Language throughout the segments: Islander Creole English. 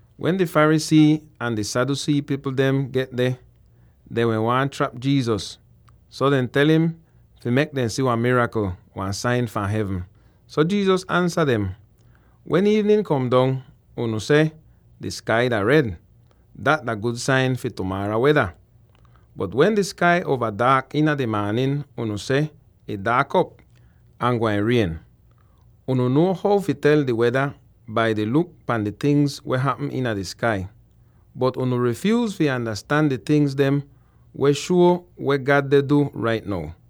Wen di Pharisee ahn di Sadducee pipl dem get deh, dehn wehn waahn trap Jesus, so dehn tel im fi mek dem si wan mirakl, wan sain fahn hevn. So Jesus ansa dem, “Wen iivnin kom dong, unu seh, ‘Di skai dah red; dat dah gud sain fi tumaara weda!’ Bot wen di skai uova daak iina di maanin, unu seh, ‘Ih daak op, ahn gwain rien!’ Unu nuo how fi tel di weda bai deh luk pan di tingz dem weh hapm iina di skai, bot unu rifyuuz fi andastan di tingz dem weh shuo weh God deh du rait now.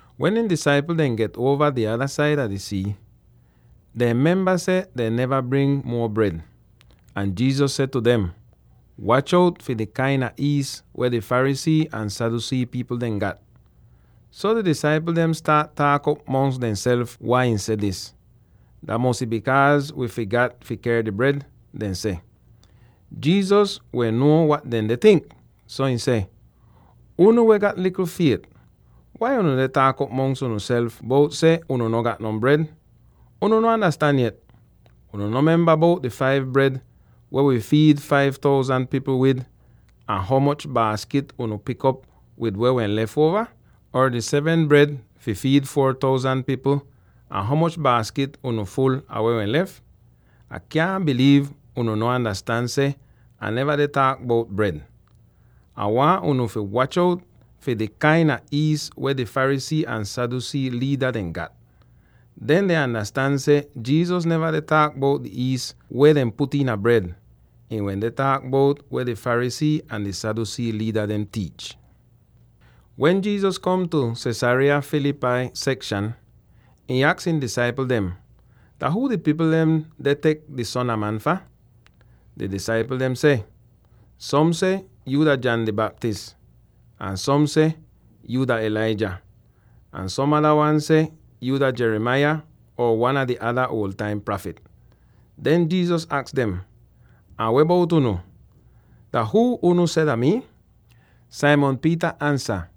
Wen ihn disaipl dehn get uova di ada saida di sii, dehn memba seh dehn neva bring muo bred. Ahn Jesus seh tu dem, “Watch out fi di kain a iis weh di Pharisee ahn Sadducee pipl dehn gat!” So di disaipl dehn staat taak'op mongs dehnself wai ihn seh dis. “Dah mosy bikaaz wi figat fi ker di bred,” dehn seh. Jesus wehn nuo wat dehn deh tink, so ihn seh, “Unu weh gat likl fiet, wai unu deh taak'op mongs unuself bout seh unu no gat non bred? Unu no andastan yet? Unu no memba bout di five bred weh wi fiid five thousand pipl wid, ahn ho moch baaskit unu pik op wid weh wehn lef uova? Or di seven bred fi fiid four thousand pipl, ahn ho moch baaskit unu ful ah weh wehn lef? Ah kyaahn biliiv unu no andastan seh Ah neva deh taak bout bred! Ah waahn unu fi watch out fi di kain a iis weh di Pharisee ahn Sadducee liida dehn gat!” Den dehn andastan seh Jesus neva deh taak bout di iis weh dehn put iina di bred; ihn wende taak bout weh di Pharisee ahn di Sadducee liida dehn tiich. Wen Jesus kom tu Caesarea Philippi sekshan, ihn aks ihn disaipl dem, “Dah huu di pipl dem deh tek di Son a Man fah?” Di disaipl dehn seh, “Som seh yu dah John di Baptist, ahn som seh yu dah Elijah, ahn som ada wan seh yu dah Jeremiah or wan a di ada uol taim prafit.” Den Jesus aks dem, “Ahn weh bout unu? Dah huu unu seh dah mii?” Simon Peter ansa,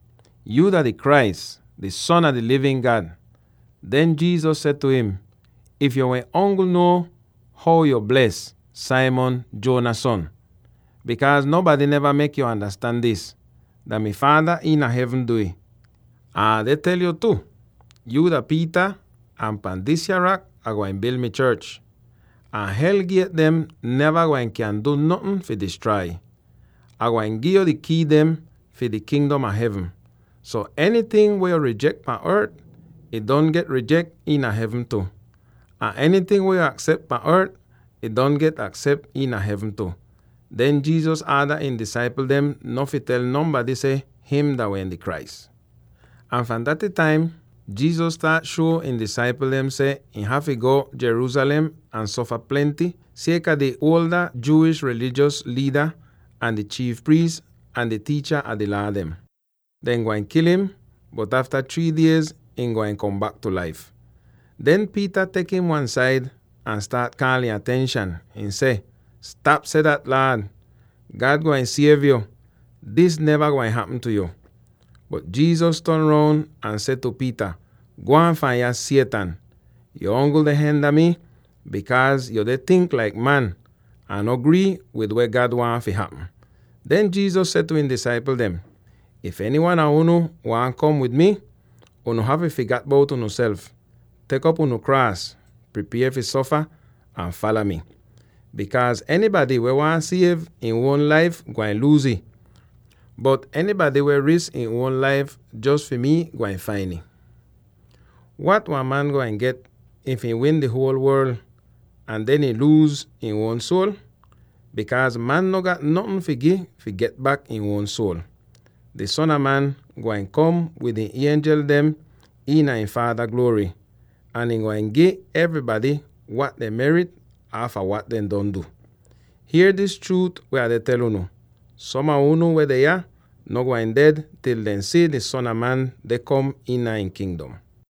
“Yuu dah di Christ, di Son a di livin God!” Den Jesus seh tu im, “If yuu wehn ongl nuo how bles yo bles, Simon, Jonah son! Bikaaz nonbady neva mek yo andastan dis; dah mi Faada iina hevn du'ih. Ahn Ah deh tel yo tu: Yuu dah Peter ahn pahn disya rak Ah gwain bil mi chorch. Ahn hel giet dem neva gwain kyan du notn fi distrai ih. Ah gwain gi'yo di kii dem fi di Kingdom a Hevn. So enyting weh yo rijek pahn ort, ih don get rijek iina hevn tu, ahn enyting weh yo aksep pahn ort, ih don get aksep iina hevn tu.” Den Jesus aada ihn disaipl dem no fi tel nonbady seh him dah di Christ. Ahn fahn daty taim, Jesus staat shuo ihn disaipl dem seh him hafy go Jerusalem ahn sofa plenty, sieka di Jewish rilijos liida, ahn di chiif priis, ahn di tiicha a di Laa dem. Dehn gwain kil im, bot afta three diez ihn gwain kom bak tu laif. Den Peter tek im wan-said ahn staat kaal ihn atenshan; ihn seh, “Stap seh dat, Laad! God gwain siev yo; dis neva gwain hapm tu yo!” Bot Jesus ton roun ahn seh tu Peter, “Gwaan fahn yah, Satan! Yuu ongl deh hinda mii, bikaaz yu deh tink laik man, ahn no grii wid weh God waahn fi hapm!” Den Jesus seh tu ihn disaipl dem, “If enywan a unu waahn kom wid mii, unu hafy figat bout unuself, tek op unu kraas —pripier fi sofa— ahn fala mi. Bikaaz enybady weh waahn siev ihn uon laif gwain luuz ih, bot enybady weh wi risk ihn uon laif jos fi mi, gwain fain ih. Wat wan man gwain get if ihn win di huol worl, ahn den luuz ihn uon suol? Bikaaz man no gat notn fi gi fi get bak ihn uon suol! Di Son a Man gwain kom wid ihn ienjel dem iina ihn Faada gluory, ahn ihn gwain gi evrybady wat dehn merit aafa wat dehn don du. Hier dis chruut weh Ah deh tel unu: Som a unu weh deh yah no gwain ded til dehn si seh di Son a Man deh kom iina ihn Kingdom.”